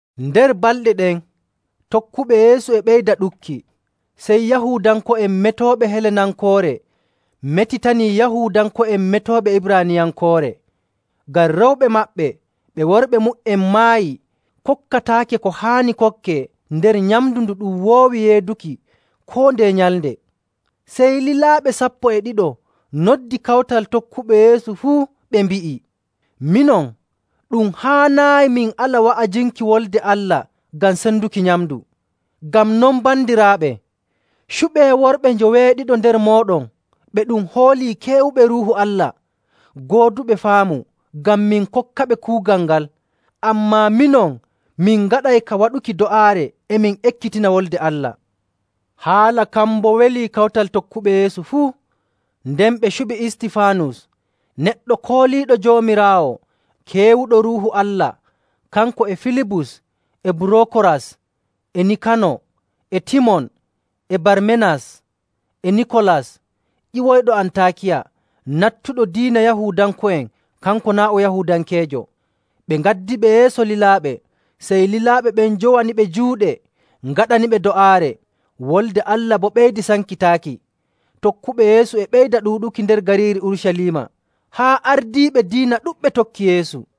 Nder balɗe ɗen, tokkuɓe Yeesu e ɓeyda ɗuɗki. Sey Yahuudanko'en metooɓe Helenankoore: Nder ɗemngal boɗe'en e ɗum wi'ee Greek. metitani Yahuudanko'en metooɓe Ibraaniyankoore, ngam rewɓe maɓɓe ɓe worɓe mu''en maayi kokkataake ko haani kokkee nder nyamndu ndu ɗum woowi yeeduki koo ndeye nyalnde. Sey lilaaɓe sappo e ɗiɗo noddi kawtal tokkuɓe Yeesu fuu, ɓe mbi'i, “Minon, ɗum haanaayi min ala wa'ajinki Wolde Allah ngam senduki nyamndu. Ngam non, bandiraaɓe, cuɓee worɓe njoweeɗiɗo nder mooɗon ɓe ɗum hoolii keewuɓe Ruuhu Allah, gooduɓe faamu ngam min kokkaɓe kuugal ngal. Ammaa minon, min ngaɗay ka waɗuki do'aare e min ekkitina Wolde Allah.” Haala kan boo welii kawtal tokkuɓe Yeesu fuu. Nden ɓe cuɓi Istifaanus, neɗɗo kooliiɗo Joomiraawo, keewuɗo Ruuhu Allah, kanko e Filibus e Burokoras e Nikano e Timon e Barmenas e Nikolas ƴiwoyɗo Antaakiya, nattuɗo diina Yahuudanko'en kanko naa' o Yahuudankeejo. Ɓe ngaddiɓe yeeso lilaaɓe. Sey lilaaɓe ɓen njowaniɓe juuɗe, ngaɗaniɓe do'aare. Wolde Allah boo ɓeydi sankitaaki. Tokkuɓe Yeesu e ɓeyda ɗuuɗuki nder gariiri Urucaliima, haa ardiiɓe diina ɗuɗɓe tokki Yeesu.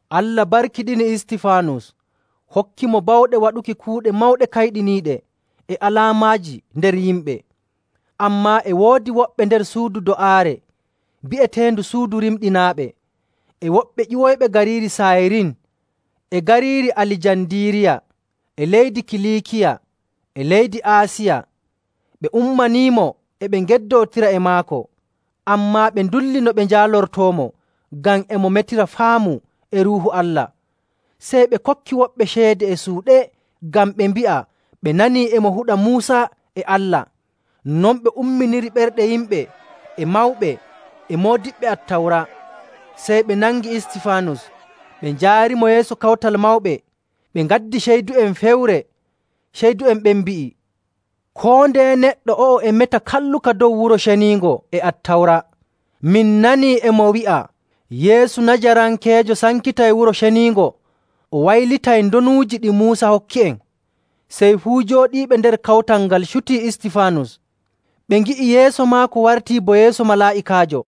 Allah barkiɗini Istifaanus hokkimo bawɗe waɗuki kuuɗe mawɗe kayɗiniiɗe e alaamaaji nder yimɓe. Ammaa e woodi woɓɓe nder suudu do'aare bi'eteendu Suudu Rimɗinaaɓe, e woɓɓe ƴiwoyɓe gariiri Saayirin e gariiri Alijandiiriya e leydi Kiliikiya e leydi Aasiya, ɓe ummaniimo e ɓe ngeddootira e maako. Ammaa ɓe ndulli no ɓe njaalortoomo ngam e mo metira faamu e Ruuhu Allah. Sey ɓe kokki woɓɓe ceede e suuɗe ngam ɓe mbi'a ɓe nanii e mo huɗa Muusa e Allah. Non ɓe umminiri ɓerɗe yimɓe e mawɓe e moodiɓɓe Attawra. Sey ɓe nangi Istifaanus, ɓe njaarimo yeeso Kawtal Mawɓe, ɓe ngaddi ceydu'en fewre. Ceydu'en ɓen mbi'i, “Koo ndeye neɗɗo o'o e meta kalluka dow Wuro Ceniingo e Attawra. Min nanii e mo wi'a Yeesu Najarankeejo sankitay Wuro Ceniingo, o waylitay ndonuuji ɗi Muusa hokki'en.” Sey fuu jooɗiiɓe nder kawtal ngal cutii Istifaanus, ɓe ngi'i yeeso maako wartii bo yeeso malaa'ikaajo.